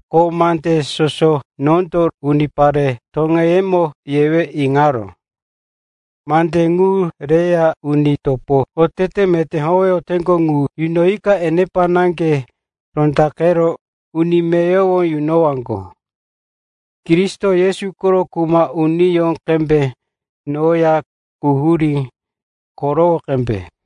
Ko mande soso nondo unipare toŋeyemo yewe iŋaró, mande ŋu reya uni topo otete meté howeyoteŋgo ŋu yunoyika enepa naŋge rondaqero uni meyowo yunowaŋgo. Kristo Yesu koro kuma uniyó qembe noya quhurí korowo qembe.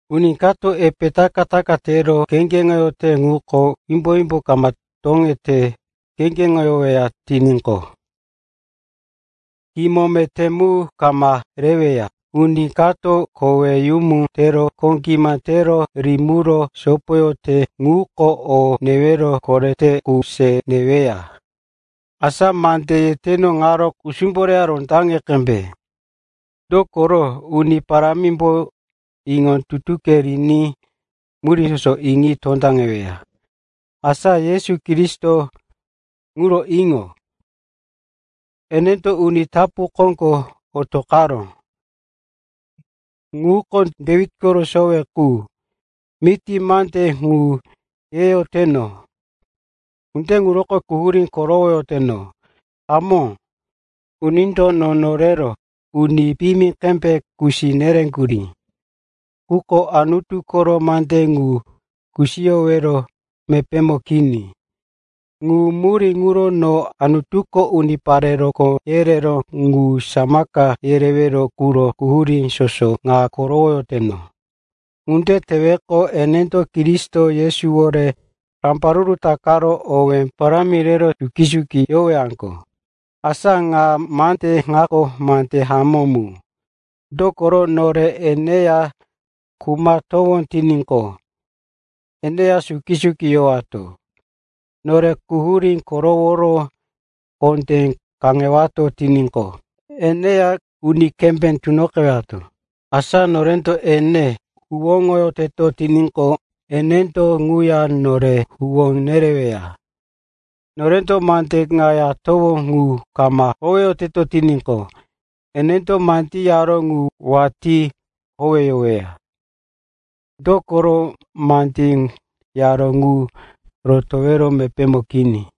Uni kato epe taka-taka tero kheŋgeŋote ŋuko wimbo-wimbo toŋete kheŋgeŋoweya tiníqo, kimo meté mu kama reweya. Uni kato koweyumu tero kho gima tero rimiro sopoyote ŋuko o newero korete qu se neweya. Asa mande yeteno ŋaro kusumbo reya rondaŋe qembe, dokoro Uni Parámimbo iŋo-iŋoke riní murí soso iŋi tondaŋeweya. Asa Yesu Kristo ŋuro iŋo. Enendo uni tapu koŋgo otoqaró, ŋuko Dewit koro sowe qu. Miti mande ŋu yeyoteno. Ŋunde ŋuroko quhurí korowoyoteno. Hamó, unindo no norero uni piyimi qembe kusi nereŋgurí. Quko Anutu koro mande ŋu kusiyowero mepémo kini. Ŋu murí ŋuro no Anutuko unipare rokó yereró ŋu samaka yerewero quro quhurí soso ŋa korowoyoteno. Ŋunde teweqo, enendo Kristo Yesuwore rambaruru takaro owé parámi rero suki-suki yowaŋgo. Asa ŋa mande ŋako mande hamó mu, dokoro, nore eneya khumatowó tiníqo, eneya suki-suki yowato. Nore quhurí koroworo kondé kaŋewato tiníqo, eneya uni kembé tunoqewato. Asa norendo ene huwóŋoyoteto tiníqo, enendo ŋuya nore huwó nereweya. Norendo mande ka yatowó ŋu kama howeyoteto tiníqo, enendo mandí yaró ŋu watí howeyoweya, dokoro mandí yaró ŋu rotowero mepémo kini.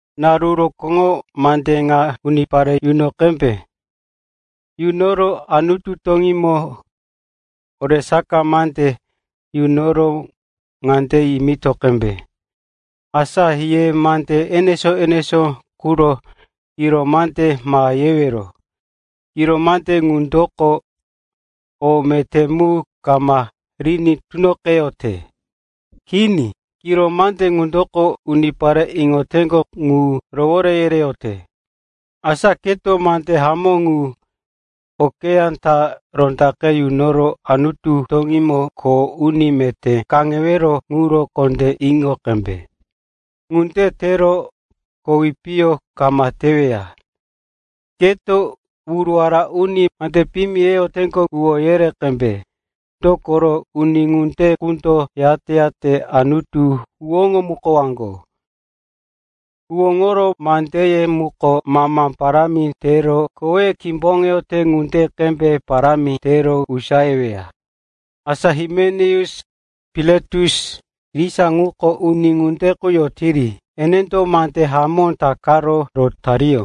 Naru rokóŋo mande ŋa unipare yuno qembe. Yunoro Anutu toŋímo oresaka mande yunoro ŋande yimito qembe, asa ye mande enesó-enesó quro kiro mande ma yewero. Kiro mande ŋundoko o meté mu kama riní tunoqeyote. Kini, kiro mande ŋundoko unipare iŋoyoteŋgo ŋu rowore yereyote. Asa, keto mande hamó ŋu okeyá ta rondaqe yunoro Anutu toŋímo kho uni meté kaŋewero ŋuro kondé iŋo qembe. Ŋunde tero kowi piyo kama teweya. Keto wuruwara uni mande piyimi yeyoteŋgo ŋu huwó yere qembe, dokoro uni ŋunde qundo yate-yate Anutu huwóŋomukowaŋgo. Huwóŋoro mandeye muko mama parámi tero koweye kimboŋeyote ŋunde qembe parámi tero usayeweya. Asa Himeneus, Piletus, irisa ŋuko uni ŋunde qu yotiri. Enendo mande hamó takaro rotariyó.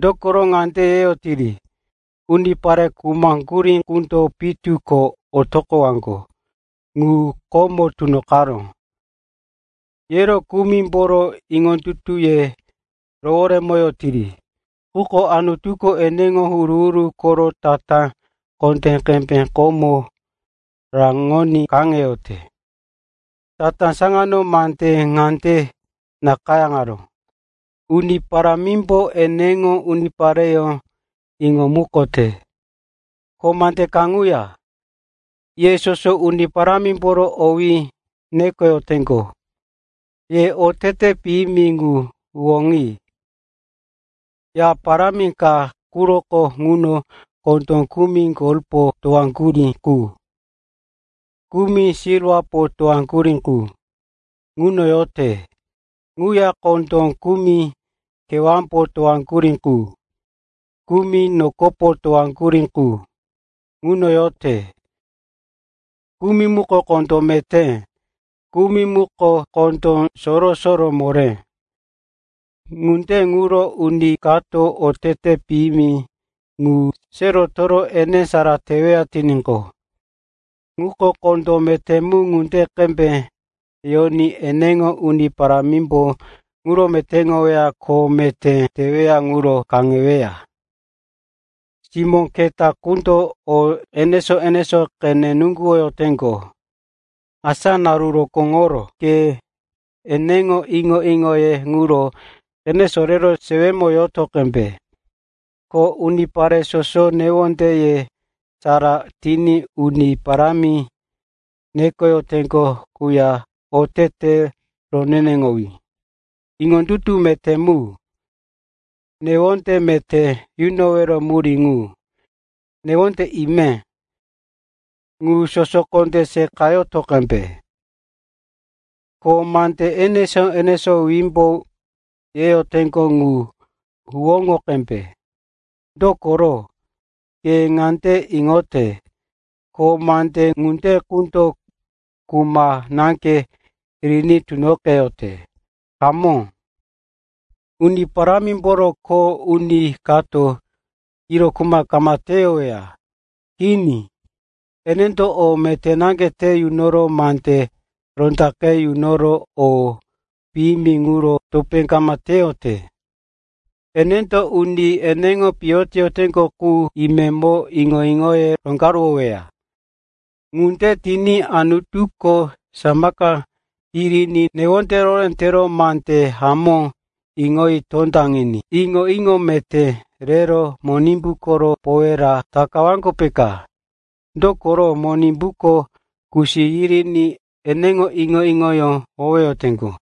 Dokoro ŋande yeyotiri, “Unipare khumaŋgurí qundo pitu ko otoqowaŋgo ŋu komo tunoqaró,” yero kumimboro iŋondutuye roworemoyotiri. Quko Anutuko eneŋo huru-huru koro tatá kondé qembe komo raŋoní kaŋeyote. Tatá saŋano mande ŋande nakayáŋaró, “Uni Parámimbo eneŋo unipareyó iŋomukote.” Ko mande kaŋuya, “Ye soso Uni Parámimboro owí nekoyoteŋgo, ye otete piyimi ŋu huwóŋi.” Ya parámi ka quroko ŋuno kondó kumi golpo towaŋgurí qu, kumi silwapo towaŋgurí qu ŋuno yoteŋgo. Ŋuya kondó kumi kewámbo towaŋgurí qu, kumi nokopo towaŋgurí qu ŋuno yote. Kumi muko kondó meté, kumi muko kondó soro-soro moré. Ŋunde ŋuro uni kato otete piyimi ŋu se rotoro ene sara teweya tiníqo, ŋuko kondó meté mu ŋunde qembe yoní eneŋo uni parámiyómbo ŋuro metéŋoweya ko kho meté tewero ŋuro kaŋeweya. Simó keta qundo o enesó-enesó qene nuŋguwoyoteŋgo. Asa naru rokóŋoro ke eneŋo iŋo-iŋoye ŋuro qene sorero sewemo yoto qembe. Ko unipare soso newondeye sara tiní Uni Parámi nekoyoteŋgo quya otete roneneŋowí, iŋondutu meté mu, newonde meté yunowero murí ŋu, newonde ime, ŋu soso kondé seqayoto qembe. Ko mande enesó-enesó wimbo yeyoteŋgo ŋu huwóŋo qembe. Dokoro ke ŋande iŋote, ko mande ŋunde qundo kuma naŋge riní tunoqeyote. Hamó, Uni Parámimboro kho uni kato kiro kuma kama teyoweya. Kini, enendo o meté naŋge te yunoro mande rondaqe yunoro o piyimi ŋuro topé kama teyote. Enendo uni ene pitoyoteŋgo qu imemo iŋo-iŋoye roŋgaruwoweya. Ŋunde tiní Anutuko samaka yiriní newonde rohoré tero mande hamó iŋoyi tondaŋiní iŋo-iŋo meté rero Monimbu koro powera takawaŋgo, peka. Dokoro Monimbuko kusi yiriní eneŋo iŋo-iŋoyó howeyoteŋgo.